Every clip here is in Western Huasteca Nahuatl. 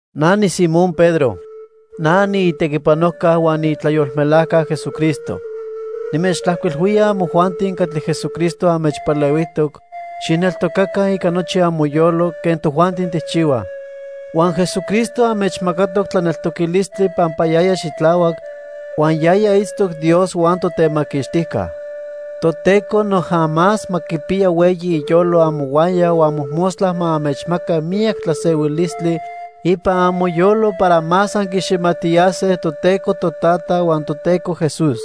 Na niSimón Pedro. Na niitequipanojca huan niitlayolmelajca Jesucristo. Nimechtlajcuilhuía amojuanti catli Jesucristo anmechpalehuijtoc xijneltocaca ica nochi amoyolo quen tojuanti tijchihuaj. Huan Jesucristo anmechmacatoc tlaneltoquilistli pampa yaya xitlahuac, huan yaya itztoc Dios huan Totemaquixtijca. Toteco noja más ma quipiya hueyi iyolo amohuaya huan mojmostla ma anmechmaca miyac tlasehuilistli ipan amoyolo para más anquiniximajtiyase Toteco Totata huan Toteco Jesús.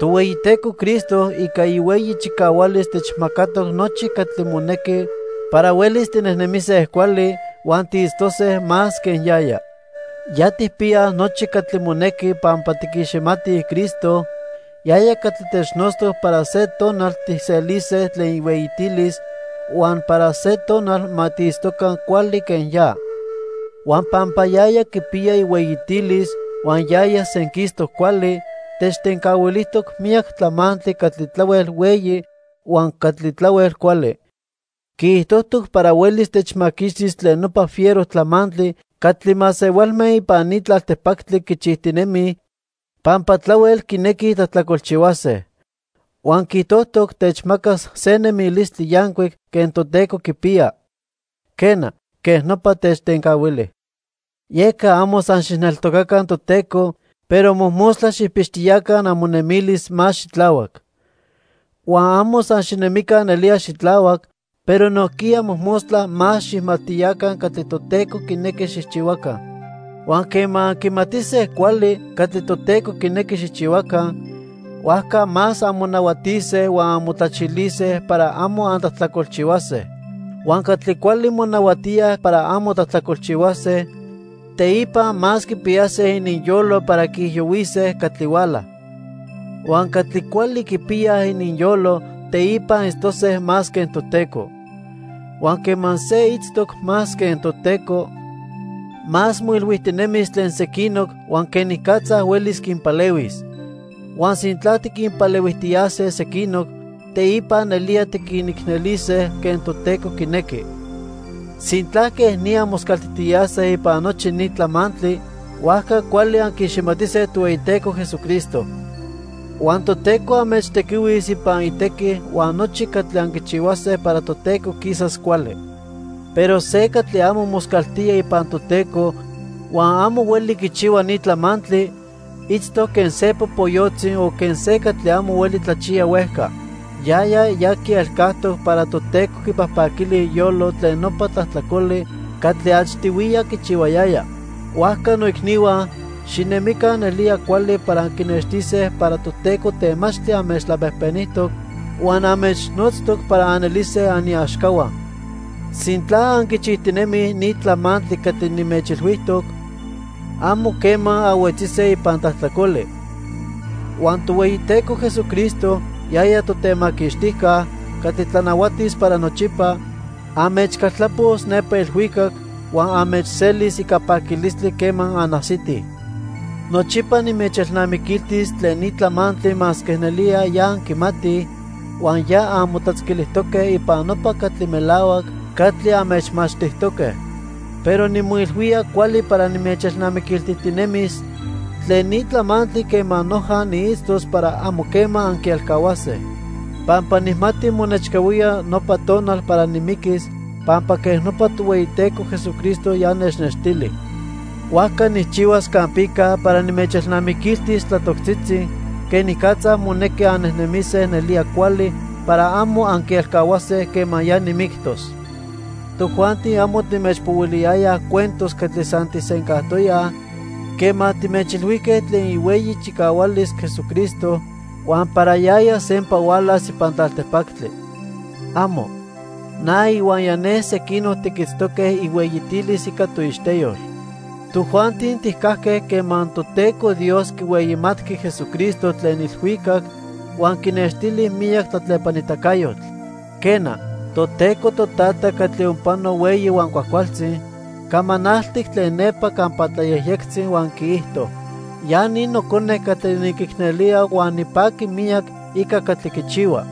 Tohueyiteco Cristo ica ihueyi chicahualis techmacatoc nochi catli monequi para huelis tinejnemise cuali huan tiitztose más quen yaya. Ya tijpiyaj nochi catli monequi pampa tiquiximatij Cristo, yaya catli technotztoc para se tonal tijselise tlen ihueyitilis huan para se tonal ma tiitztoca cuali quen ya. Huan pampa yaya quipiya ihueyitilis huan yaya senquistoc cuali, techtencahuilijtoc miyac tlamantli catli tlahuel hueyi huan catli tlahuel cuali. Quiijtojtoc para huelis techmaquixtis tlen nopa fiero tlamantli catli masehualme ipan ni tlaltipactli quichijtinemij pampa tlahuel quinequij tlajtlacolchihuase. Huan quiijtojtoc techmacas se nemilistli yancuic quen Toteco quipiya. Quena, quej nopa techtencahuili. Yeca amo san xijneltocaca Toteco, pero mojmostla xijpixtiyaca amonemilis más xitlahuac. Huan amo san xinemica nelía xitlahuac, pero nojquiya mojmostla más xijmajtiyaca catli Toteco quinequi xijchihuaca. Huan quema anquimatise cuali catli Toteco quinequi xijchihuaca, huajca más anmonahuatise huan anmotlachilise para amo antlajtlacolchihuase. Huan catli cuali monahuatíaj para amo tlajtlacolchihuase, teipa más quipiyase ininyolo para quiijiyohuise catli huala. Huan catli cuali quipiyaj ininyolo, teipa itztose más quen Toteco. Huan quema se itztoc más quen Toteco, más moilhuijtinemis tlen sequinoc huan quenicatza huelis quinpalehuis. Huan sintla tiquinpalehuijtiyase sequinoc, teipa nelía tiquinicnelise quen Toteco quinequi. Sintla quej ni anmoscaltijtiyase ipan nochi ni tlamantli, huajca cuali anquiiximatise Tohueyiteco Jesucristo. Huan Toteco anmechtequihuis ipan itequi huan nochi catli anquichihuase para Toteco quisas cuali. Pero se catli amo moscaltía ipan Toteco huan amo hueli quichihua ni tlamantli itztoc quen se popoyotzi o quen se catli amo hueli tlachiya huejca. Yaya ya quielcajtoc para Toteco quipajpaquili iyolo tlen nopa tlajtlacoli catli achtihuiya quichihuayaya. Huajca noicnihua, xinemica nelía cuali para anquinextise para Toteco temachtli anmechtlapejpenijtoc huan anmechnotztoc para anelise aniaxcahua. Sintla anquichijtinemij ni tlamantli catli nimechilhuijtoc, amo quema anhuetzise ipan tlajtlacoli. Huan Tohueyiteco Jesucristo, yaya Totemaquixtijca, catli tlanahuatis para nochipa, anmechcaltlapos nepa ilhuicac huan anmechselis ica paquilistli quema anajsitij. Nochipa nimechelnamiquiltis tlen ni tlamantli masque nelía ya anquimatij huan ya anmotlatzquilijtoque ipan nopa catli melahuac catli anmechmachtijtoque. Pero nimoilhuía cuali para nimechelnamiquiltijtinemis tlen ni tlamantli quema noja niitztos para amo quema anquielcahuase. Pampa nijmati monechcahuía nopa tonal para nimiquis pampa quej nopa Tohueyiteco Jesucristo ya nechnextili. Huajca nijchihuas campica para nimechelnamiquiltis tlatoctzitzi quenicatza monequi annejnemise nelía cuali para amo anquielcahuase quema ya nimictos. Tojuanti amo timechpohuiliyayaj cuentos catli san tijsencajtoyaj quema timechilhuijque tlen ihueyi chicahualis Jesucristo huan para yaya sempa hualas ipan tlaltipactli. ¡Amo! Na ihuaya ne sequinoc tiquitztoque ihueyitilis ica toixteyol. Tojuanti tijcajque quema Toteco Dios quihueyimatqui Jesucristo tlen ilhuicac huan quinextili miyac tlatlepanitacayotl. Quena, Toteco Totata catli onpano hueyi huan cuajcualtzi camanaltic tlen nepa campa tlayejyectzi huan quiijto: "Ya ni Nocone catli niquicnelía huan nipaqui miyac ica catli quichihua."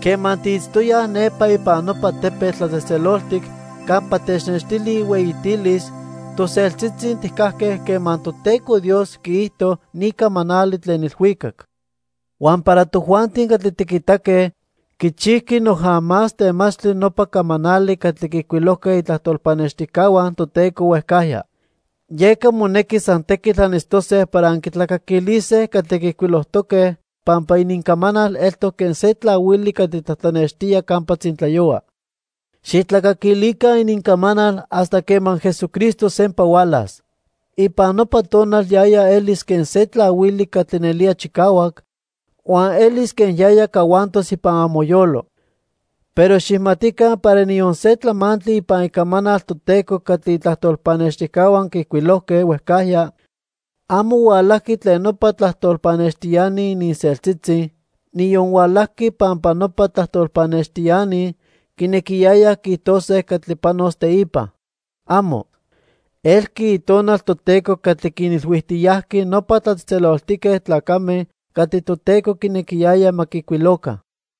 Quema tiitztoyaj nepa ipan nopa tepetl tlatzejtzeloltic campa technextili ihueyitilis, toseltzitzi tijcajque quema Toteco Dios quiijto ni camanali tlen ilhuicac. Huan para tojuanti catli tiquitaque, quichijqui noja más temachtli nopa camanali catli quiijcuilojque itlajtol pannextijcahua Toteco huejcajya. Yeca monequi san tequitl anitztose para anquitlacaquilise catli quiijcuilojtoque pampa inincamanal eltoc quen se tlahuili catli tlatlanextía campa tzintlayohua. Xijtlacaquilica inincamanal hasta quema Jesucristo sempa hualas. Ipan nopa tonal yaya elis quen se tlahuili catli nelía chicahuac, huan elis quen yaya cahuantos ipan amoyolo. Pero xijmatica para niyon se tlamantli ipan Icamanal Toteco catli itlajtol pannextijcahua quiijcuilojque huejcajya, amo hualajqui tlen nopa tlajtol pannextiani ininseltzitzi, niyon hualajqui pampa nopa tlajtol pannextiani quinequiyayaj quiijtose catli panos teipa. ¡Amo! Elqui Itonal Toteco catli quinilhuijtiyajqui nopa tlatzejtzeloltique tlacame catli Toteco quinequiyaya ma quiijcuiloca.